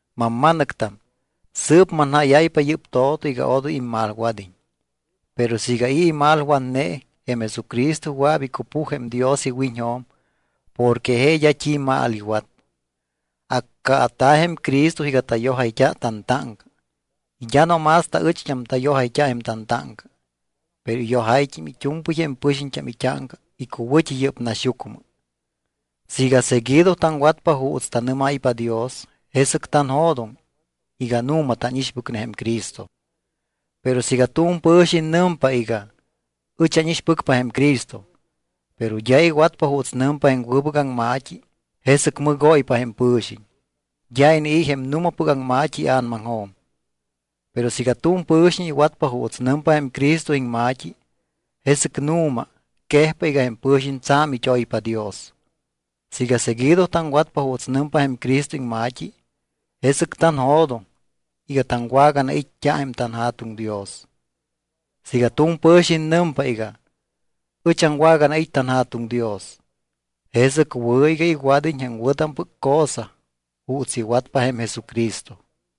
Mamma̱nɨctam, sɨɨp manjáyáypa yɨ́p to̱to iga odoy immalwad́iñ. Pero siiga i̱ imalwatne, jém Jesucristo wɨa̱p icupuj jém Dios iwiñjo̱m porque je d́a t́i mal iwat. Accaata̱ jém Cristo iga tayojayt́a tantáŋca. Y d́a no más taɨcht́am tayojayt́a jém tantáŋca, pero iyojáyt́im it́u̱mpɨy jém pɨxiñt́am it́áŋca icuwɨ̱t́i yɨ́p naxyucmɨ. Siiga seguido taŋwatpa juuts tanɨ́máypa Dios, jesɨc tanjo̱doŋ iga nu̱ma tánixpɨcne jém Cristo. Pero siiga tu̱m pɨ̱xiñ nɨmpa iga: Ɨch ánixpɨcpa jém Cristo, pero d́a iwatpa juuts nɨmpa jém wɨbɨc aŋma̱t́i, jesɨc mɨgóypa jém pɨ̱xiñ. D́a inii̱ jém nu̱mapɨc aŋma̱t́i ia̱namaŋjo̱m. Pero siiga tu̱m pɨ̱xiñ iwatpa juuts nɨmpa jém Cristo iŋma̱t́i, jesɨc nu̱ma quejpa iga jém pɨ̱xiñ tsa̱m it́oypa Dios. Siiga seguido taŋwatpa juuts nɨmpa jém Cristo iŋma̱t́i, jesɨc tanjo̱doŋ iga taŋwaganait́t́a jém tanJa̱tuŋ Dios. Siiga tu̱m pɨ̱xiñ nɨmpa iga: Ɨch aŋwaganait́ tanJa̱tuŋ Dios, jesɨc wɨ̱ iga iwad́iñ jém wɨ̱tampɨc cosa juuts iwatpa jém Jesucristo.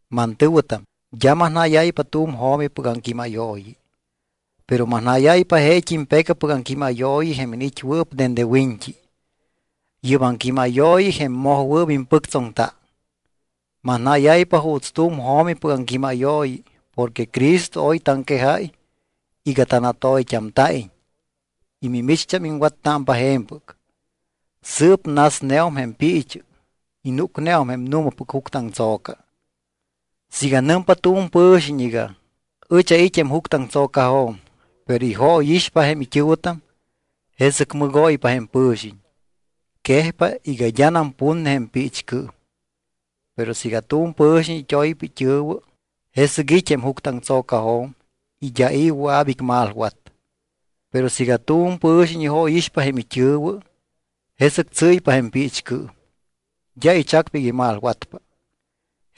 Mantɨ̱wɨtam, d́a manjáyáypa tu̱m jo̱mipɨc aŋquímayooyi, pero manjáyáypa jeet́im pecapɨc aŋquímayooyi jém iniit́wɨɨp dende wiñt́i. Yɨ́p aŋquímayooyi jém mojwɨɨp impɨctsoŋta. Manjáyáypa juuts tu̱m jo̱mipɨc aŋquímayooyi porque Cristo oy taŋquejáy iga tanatoyt́amta̱iñ y mimicht́am iŋwattámpa je̱mpɨc. Sɨɨp nasneum jém piichɨ y núcneum jém nu̱mapɨc juctɨaŋtso̱ca. Siiga nɨmpa tu̱m pɨ̱xiñ iga: Ɨch ait́ jém juctɨaŋtso̱cajo̱m, pero ijóyixpa jém it́ɨ̱wɨtam, jesɨc mɨgóypa jém pɨ̱xiñ. Quejpa iga d́anam putne jém piichcɨɨm. Pero siiga tu̱m pɨ̱xiñ it́oypa it́ɨ̱wɨ, jesɨc it́ jém juctɨaŋtso̱cajo̱m y d́a i̱ wɨa̱p icmalwat. Pero siiga tu̱m pɨ̱xiñ ijóyixpa jém it́ɨ̱wɨ, jesɨc tsɨ́ypa jém piichcɨɨm. D́a ichacpa iga imalwatpa.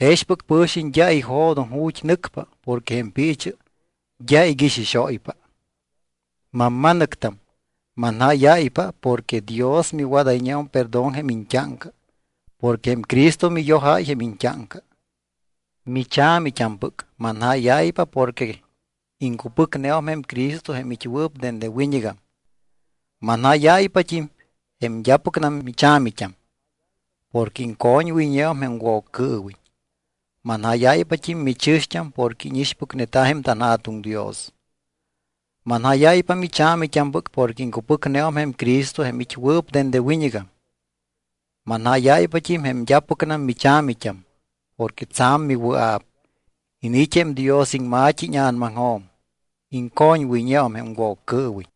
Jexpɨc pɨ̱xiñ d́a ijo̱doŋ ju̱t́ nɨcpa porque jém piichɨ d́a iguixixóypa. Mamma̱nɨctam, manjáyáypa porque Dios miwadayñeum perdón jém iñt́áŋca porque jém Cristo miyojáy jém iñt́áŋca. Micha̱mit́ampɨc, manjáyáypa porque iŋcupɨcneum jém Cristo jém it́wɨɨp dende wiñɨgam. Manjáyáypat́im, jém d́apɨcnam micha̱mit́am, porque iŋcoñwɨyñeum jém Woccɨɨwiñ. Manjáyáypat́im michɨ̱xt́am porque íñixpɨcneta jém tanJa̱tuŋ Dios. Manjáyáypa micha̱mit́ampɨc porque iŋcupɨcneum jém Cristo jém it́wɨɨp dende wiñɨgam. Manjáyáypat́im jém d́apɨcnam micha̱mit́am porque tsa̱m miwɨa̱p. Iniit́ jém Dios iŋma̱t́i íña̱namaŋjo̱m. Iŋcoñwɨyñeum jém Woccɨɨwiñ.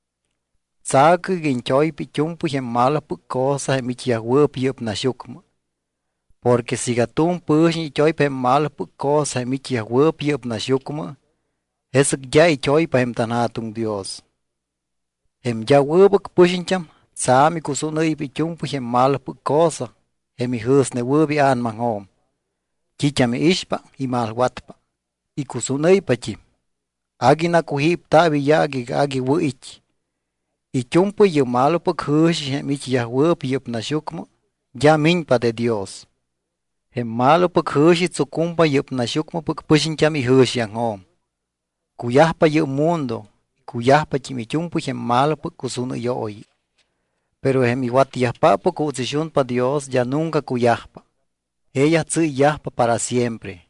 Tsa̱cɨ iga iñt́oypa it́u̱mpɨy jém malopɨc cosa jém it́yajwɨɨp yɨ́p naxyucmɨ. Porque siiga tu̱m pɨ̱xiñ it́oypa jém malopɨc cosa jém it́yajwɨɨp yɨ́p naxyucmɨ, jesɨc d́a it́oypa jém tanJa̱tuŋ Dios. Jém d́a wɨbɨc pɨxiñt́am tsa̱m icusúnɨ́ypa it́u̱mpɨy jém malopɨc cosa jém ijɨ̱snewɨɨp ia̱namaŋjo̱m. T́it́am iixpa imalwatpa, icusúnɨ́ypat́im. Agui nacujípta̱p iyaac iga agui wɨ̱ it́. It́u̱mpɨy yɨ́p malopɨc jɨ̱xi jém it́yajwɨɨp yɨ́p naxyucmɨ d́a miñpa de Dios. Jém malopɨc jɨ̱xi tsucumpa yɨ́p naxyucmɨpɨc pɨxiñt́am ijɨ̱xiaŋjo̱m. Cuyajpa yɨ́p mundo y cuyajpat́im it́u̱mpɨy jém malopɨc cusúnɨyooyi. Pero jém iwatyajpáppɨc juuts ixunpa Dios d́a nunca cuyajpa. Jeeyaj tsɨ́yyajpa para siempre.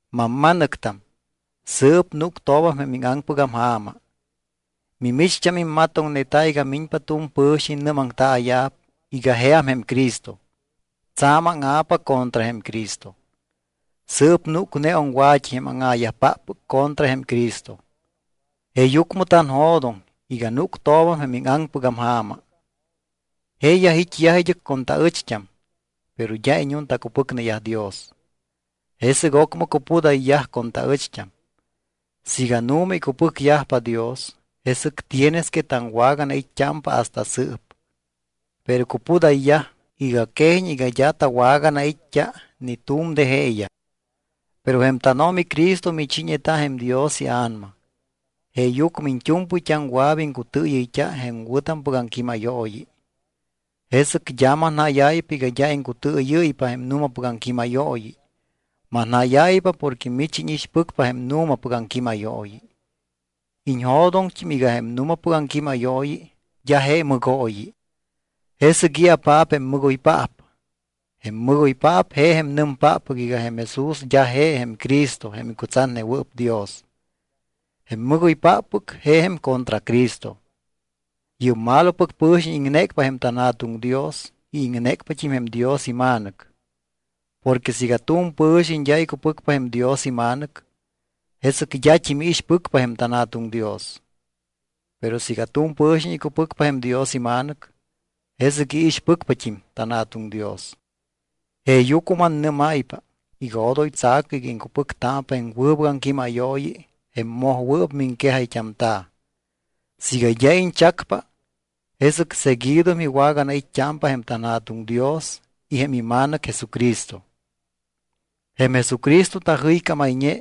Mamma̱nɨctam, sɨɨp núctoobam jém íŋaŋpɨgam ja̱ma. Mimicht́am immatoŋneta iga miñpa tu̱m pɨ̱xiñ nɨ́maŋtaaya̱p iga jeam jém Cristo. Tsa̱m áŋa̱pa contra jém Cristo. Sɨɨp núcneum wa̱t́i jém áŋa̱yajpáppɨc contra jém Cristo. Jeeyucmɨ tanjo̱doŋ iga núctoobam jém íŋaŋpɨgam ja̱ma. Jeeyaj it́yaj id́ɨc con taɨcht́am, pero d́a iñuntacupɨcneyaj Dios. Jesɨc ocmɨ cupudayyaj con taɨcht́am. Siiga nu̱ma icupɨcyajpa Dios, jesɨc tienes que taŋwaganait́t́ámpa hasta sɨɨp. Pero cupudayyaj iga quejiñ iga d́a tawaganait́t́a ni tu̱m de jeeyaj. Pero jém tánO̱mi Cristo michiiñeta jém Dios iA̱nama, jeeyucmɨ iñt́u̱mpɨyt́am wɨa̱p iŋcutɨɨyɨyt́a jém wɨ̱tampɨc aŋquímayooyi. Jesɨc d́a manjáyáypa iga d́a iŋcutɨɨyɨ́ypa jém nu̱mapɨc aŋquímayooyi. Manjáyáypa porque mich íñixpɨcpa jém nu̱mapɨc aŋquímayooyi. Iñjo̱doŋt́im iga jém nu̱mapɨc aŋquímayooyi d́a je mɨgooyi. ¿Jesɨc i̱apaap jém mɨgoypaap? Jém mɨgoypaap je jém nɨmpáppɨc iga jém Jesús d́a je Cristo jém icutsatnewɨɨp Dios. Jém mɨgóypáppɨc je jém contracristo. Yɨ́p malopɨc pɨ̱xiñ iŋnécpa jém tanJa̱tuŋ Dios y iŋnécpat́im jém Dios iMa̱nɨc. Porque siiga tu̱m pɨ̱xiñ d́a icupɨcpa jém Dios iMa̱nɨc, jesɨc d́at́im iixpɨcpa jém tanJa̱tuŋ Dios. Pero siiga tu̱m pɨ̱xiñ icupɨcpa jém Dios iMa̱nɨc, jesɨc iixpɨcpat́im tanJa̱tuŋ Dios. Jeeyucmɨ mannɨ́máypa iga odoy tsa̱cɨ iga iŋcupɨctámpa jém wɨbɨc aŋquímayooyi jém mojwɨɨp miŋquejayt́amta̱. Siiga d́a iñchacpa, jesɨc seguido miwaganait́t́ámpa jém tanJa̱tuŋ Dios y jém iMa̱nɨc Jesucristo. Jém Jesucristo tajɨycámayñe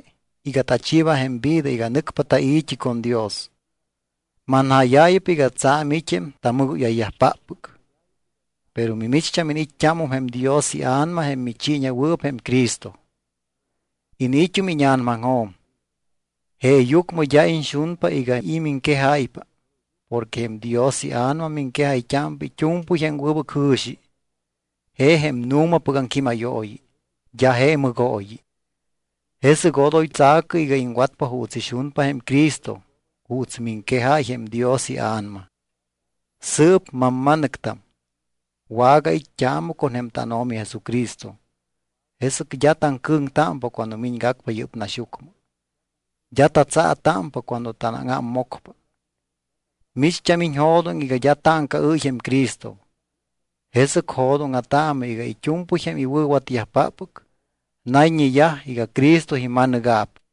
iga tachiiba jém vida iga nɨcpa tai̱t́i con Dios. Manjáyáypa iga tsa̱m it́ jém tamɨgóyayyajpáppɨc. Pero micht́am iniit́t́ámum jém Dios iA̱nama jém michiiñewɨɨp jém Cristo. Iniit́um íña̱namaŋjo̱m. Jeeyucmɨ d́a iñxunpa iga i̱ miŋquejáypa porque jém Dios iA̱nama miŋquejayt́ámpa it́u̱mpɨy jém wɨbɨc jɨ̱xi. Je jém nu̱mapɨc aŋquímayooyi, d́a je mɨgooyi. Jesɨc odoy tsa̱cɨ iga iŋwatpa juuts ixunpa jém Cristo juuts miŋquejáy jém Dios iA̱nama. Sɨɨp, mamma̱nɨctam, wagait́t́aamɨ con jém tánO̱mi Jesucristo, jesɨc d́a taŋcɨ̱ŋtámpa cuando miñgacpa yɨ́p naxyucmɨ, d́a tatsaa̱támpa cuando tanáŋámmocpa. Micht́am iñjo̱doŋ iga d́a táŋcaɨ́y jém Cristo. Jesɨc jo̱dóŋa̱taamɨ iga it́u̱mpɨy jém iwɨ̱watyajpáppɨc nayñeyaj iga Cristo ima̱nɨga̱p.